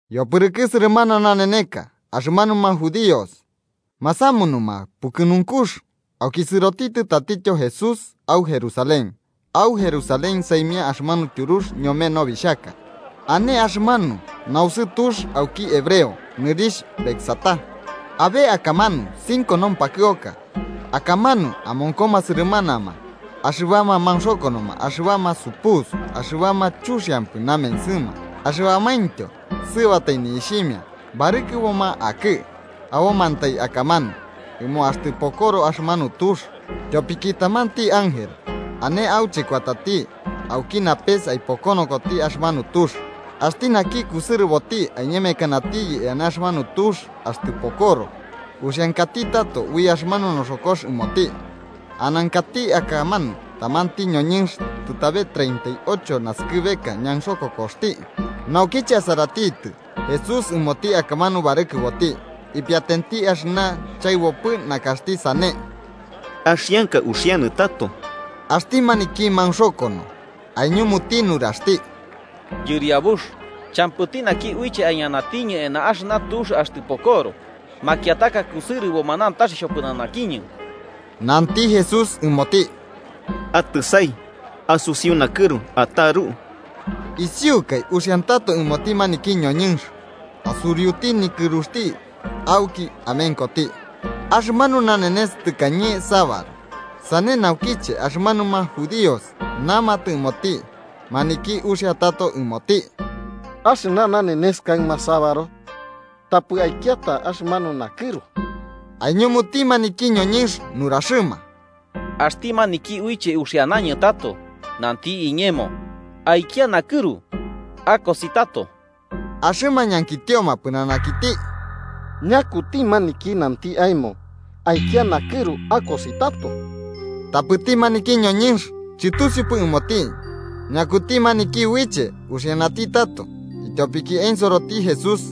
Yopɨrɨkɨ sɨrɨmana naneneka, axɨmanuma judíos masamunuma pukɨnunkux, auki sɨrotitɨ tatityo Jesús au Jerusalén. Au Jerusalén, saimia axɨmanu Tyurux ñome Nobixhaka, ane axɨmanu nausɨ tux auki hebreo nɨrixh Betzatá. Abe akamanu cinco nompakɨoka, akamanu amonkoma sɨrɨmanama axɨbama maunxokonoma, axɨbama supusu, axɨbama chuxiampɨ namensɨma, axɨbamaintyo sɨɨbatai ni'ixhimia barɨkɨboma akɨ, abomantai akamanu ɨmo axtɨ pokoro axɨmanu tux. Tyopiki tamanti ángel ane auche kuatati auki napes aipokonokoti axɨmanu tux. Axti naki kusɨrɨboti aiñemekanatiyɨ eana axɨmanu tux axtɨ pokoro, uxiankati tato ui axɨmanu noxokox ɨmoti. Anankati akamanu tamanti ñoñɨnx tɨtabe treinta y ocho naskɨbeka ñaunxokokoxti. Naukiche asaratitɨ Jesús ɨmoti akamanu barɨkɨroti ipiatenti axɨna chaɨbopɨ nakaxti sane, ñankitioti pɨnanakiti: –¿Axianka uxianɨ tato? Axti maniki maunxokono aiñumuti nuraxti: –Yɨriabux, champɨti naki uiche aiñanatiñɨ eana axɨna tux axtɨ pokoro. Makiataka kusɨrɨboma nantax xhopɨnanakiñɨ. Nanti Jesús ɨmoti: –Atɨsai, asusiu nakɨru ataru. Isiukai uxiantato ɨmoti maniki ñoñɨnx, asuriuti nikɨruxti auki amenkoti. Axɨmanu nanenes tɨkañe sabaru, sane naukiche axɨmanuma judíos namatɨ ɨmoti maniki uxia tato ɨmoti: –Axɨna nanenes kaɨma sabaru. Tapɨ aikiata axɨmanu nakɨru. Aiñumuti maniki ñoñɨnx nuraxɨma: –Axti maniki uiche uxianañɨ tato, nanti iñemo: ‘Aikia nakɨru akosi tato.’ Axɨma ñankitioma pɨnanakiti: –¿Ñakuti maniki nanti aemo: ‘Aikia nakɨru akosi tato’? Tapɨti maniki ñoñɨnx chɨtusiupɨ ɨmoti ñakuti maniki uiche uxianati tato, ityopiki ensoroti Jesús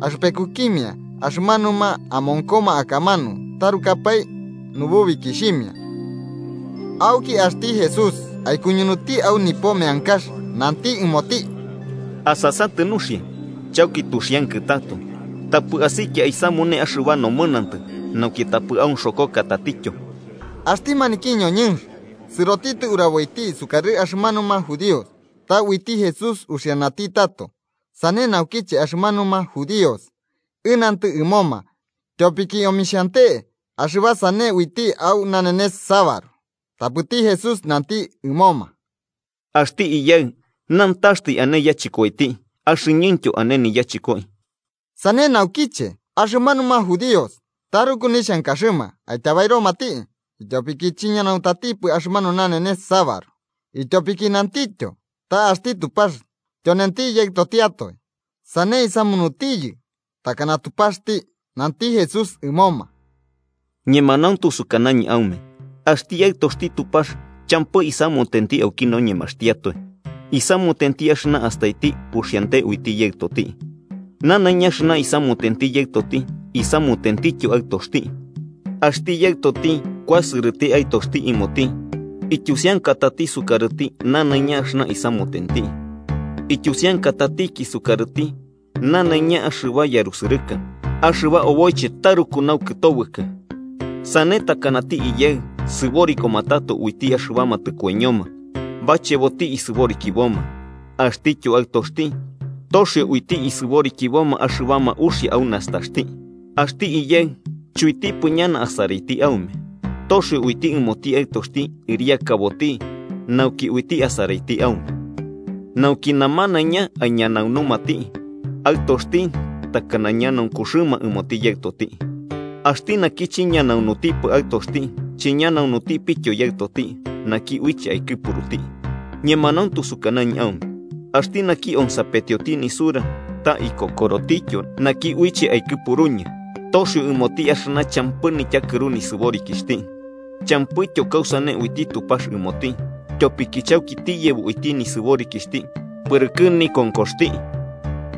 axɨpekukimia axɨmanuma amonkoma akamanu tarukapae nububikixhimia. Auki axti Jesús aikuñunuti au nipo meankax, nanti ɨmoti: –Asasatɨ nuxia, chauki tuxiankɨ tato, tapɨ asikia aisamune axɨba nomɨnantɨ, nauki tapɨ aunxokoka tatityo. Axti maniki ñoñɨnx sɨrotitɨ uraboiti sukarɨ axɨmanuma judíos ta uiti Jesús uxianati tato. Sane naukiche axɨmanuma judíos ɨnantɨ ɨmoma, tyopiki omixhante axɨba sane uiti au nanenese sabaru. Tapɨti Jesús nanti ɨmoma: –Axti Iyaɨ nantaxtai ane yachɨkoiti, axɨñɨntyo ane niyachɨkoi. Sane naukiche, axɨmanuma judíos taruku nixhankaxɨma aityabairomati, ityopiki chiñanauntatipɨ axɨmanu nanenes sabaru, ityopiki nantityo ta axti Tupax tyonenti Yaɨtotiatoe, sane isamunutiyɨ takana Tupaxti. Nanti Jesús ɨmoma: “Ñemanauntu sukanañɨ aume axti Aɨtoxti Tupax, champɨ isamutenti auki noñemaxtiatoe. Isamutenti axɨna astaiti uxiante uiti Yaɨtoti. Nanaiña axɨna isamutenti Yaɨtoti, isamutentityo Aɨtoxti. Axti Yaɨtoti kuasɨrɨti Aɨtoxti ɨmoti ityusiankatati sukarɨti nanaiña axɨna isamutenti. Ityusiankatatiki sukarɨti nanaiña axɨba yarusɨrɨka, axɨba oboiche taruku naukɨtobɨkɨ. Sane takanati Iyaɨ sɨborikoma tato uiti axɨbama tɨkoiñoma, bacheboti isɨborikiboma, axtityo Aɨtoxti toxio uiti isɨborikiboma axɨbama uxia au nastaxti. Axti Iyaɨ chuitipɨ ñana asaraiti aume, toxio uiti ɨmoti Aɨtoxti ɨriakaboti nauki uiti asaraiti aume, nauki namanaiña aiñanaunumati Aɨtoxti takana ñanaunkuxɨma ɨmoti Yaɨtoti. Axti naki chiñanaunutipɨ Aɨtoxti, chiñanaunutipityo Yaɨtoti, naki uiche aikɨpuruti. “Ñemanauntu sukanañɨ aume axti naki onsapetioti nisura ta ikokorotityo naki uiche aikɨpuruñɨ, toxio ɨmoti axɨna champɨ nityakɨru nisɨborikixhti. Champɨityo kausane uiti Tupax ɨmoti, tyopiki chauki tiyebo uiti nisɨborikixhti pɨrɨkɨ nikonkoxti.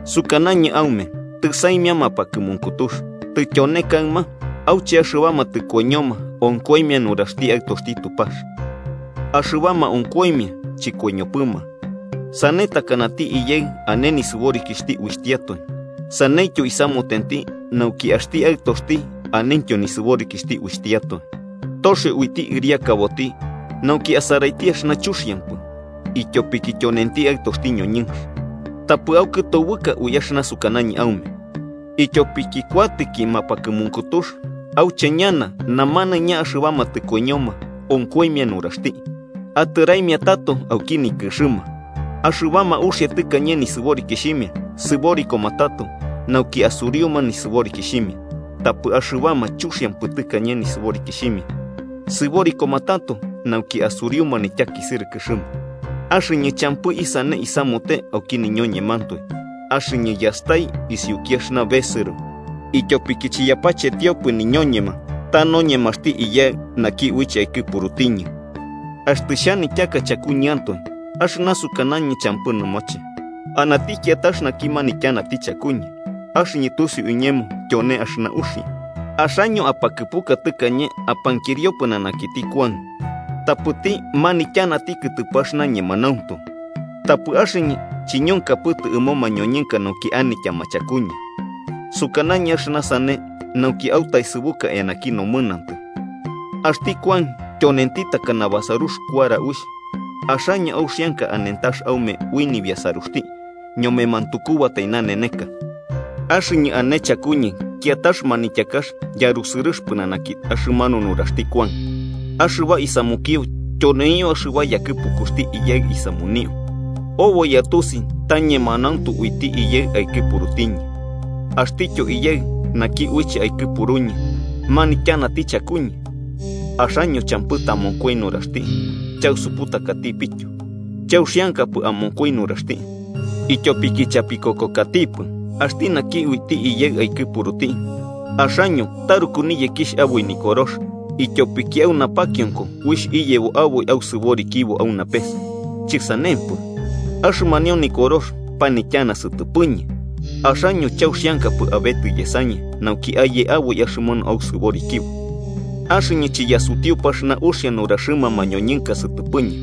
Sukanañɨ aume tɨsaimia mapakɨmunkutux, tityone kaɨma, auche axɨbama tɨkoiñoma onkoimia nuraxti Aɨtoxti Tupax. Axɨbama onkoimia, chɨkoiñopɨma. Sane takanati Iyaɨ ane nisɨborikixhti uitiatoe, saneityo isamutenti nauki axti Aɨtoxti anentyo nisɨborikixhti uitiatoe, toxio uiti ɨriakaboti nauki asaraiti axɨna chuxiampɨ, ityopiki tyonenti Aɨtoxti ñoñɨnx. Tapɨ aukɨtobɨka ui axɨna sukanañɨ aume, ityopiki kuatɨki mapakɨmunkutux auche ñana namanaiña axɨbama tɨkoiñoma onkoimia nuraxti atɨraimia tato auki nikɨxɨma. Axɨbama uxia tɨkañe nisɨborikixhimia, sɨborikoma tato nauki asuriuma nisɨborikixhimia. Tapɨ axɨbama chuxiampɨ tɨkañe nisɨborikixhimia, sɨborikoma tato nauki asuriuma nityakisɨrɨkɨxɨma. “Axɨñɨ champɨ isane isamute auki niñoñemantoe. Axɨñɨ yastai isiuki axɨna besɨro, ityopiki chiyapachetiopɨ niñoñema, ta noñemaxti Iyaɨ, naki uiche aikɨpurutiñɨ. Axtɨ xhanityaka chakuñɨantoe, axɨna sukanañɨ champɨ nɨmoche. Anati kiatax naki manityanati chakuñɨ, axɨñɨ tusiu iñemo tyone axɨna uxia. Axaño apakɨpuka tɨkañe apankirio pɨnanakiti Kuan, tapɨti manityanati kɨtɨpɨ axɨna ñemanauntu. Tapɨ axɨñɨ chiñonkapɨtɨ ɨmo mañoñɨnka nauki anityama chakuñɨ. Sukanañɨ axɨna sane nauki autaesɨbuka eanaki nomɨnantɨ. Axti Kuan tyonenti takana basarux kuara uixh, axaño auxianka anentax aume ui nibiasaruxti ñome mantukubatai naneneka. Axɨñɨ ane chakuñɨ kiatax manityakax yarusɨrɨx pɨnanaki axɨmanu nuraxti Kuan. Axɨba isamukio, tyoneio axɨba yakɨpukuxti Iyaɨ isamunio, oboi atusi ta ñemanauntu uiti Iyaɨ aikɨpurutiñɨ. Axtityo Iyaɨ, naki uiche aikɨpuruñɨ, manityanati chakuñɨ, axaño champɨ tamonkoi nuraxti chausuputakatipityo, chauxiankapɨ amonkoi nuraxti, ityopiki chapikokokatipɨ, axti naki uiti Iyaɨ aikɨpuruti. Axaño taruku niyekixh aboi Nikorox, ityopiki au napakionko uixh iyebo aboi ausɨborikibo au napes. Chɨsanempɨ, axɨmanio Nikorox panityana sɨtɨpɨñɨ, axaño chauxiankapɨ abetɨ yesañɨ nauki aye aboi axɨmanu ausɨborikibo. “Axɨñɨ chiyasutiupɨ axɨna uxia nuraxɨma mañoñɨnka sɨtɨpɨñɨ.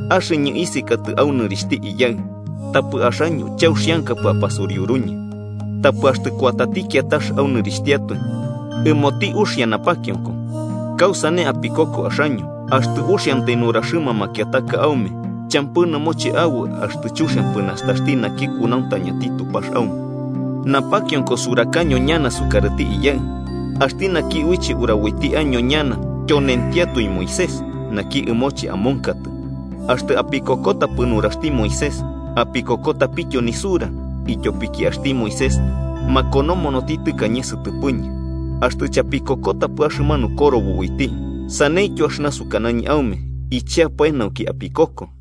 Axɨñɨ isekatɨ au nɨrixhti Iyaɨ, tapɨ axaño chauxiankapɨ apasuriuruñɨ. Tapɨ axtɨ kuatati kiatax au nɨrixhtiatoe, ɨmoti uxia napakionko. ¿Kausane apikoko axaño, axtɨ uxiantai nuraxɨma makiataka aume champɨ nɨmoche aboi axtɨ chuxiampɨ nastaxti naki kunauntañati Tupax aume? Napakionko surakaño ñana sukarɨti Iyaɨ. Axti naki uiche uraboti año ñana tyonentiatoe Moisés, naki ɨmoche amonkatɨ. Axtɨ apikokotapɨ nuraxti Moisés, apikokotapityo nisura ityopiki axti Moisés makonomonoti tɨkañe sɨtɨpɨñɨ. Axtɨ chapikokotapɨ axɨmanu korobo uiti, ¿saneityo axɨna sukanañɨ aume icheapae nauki apikoko?”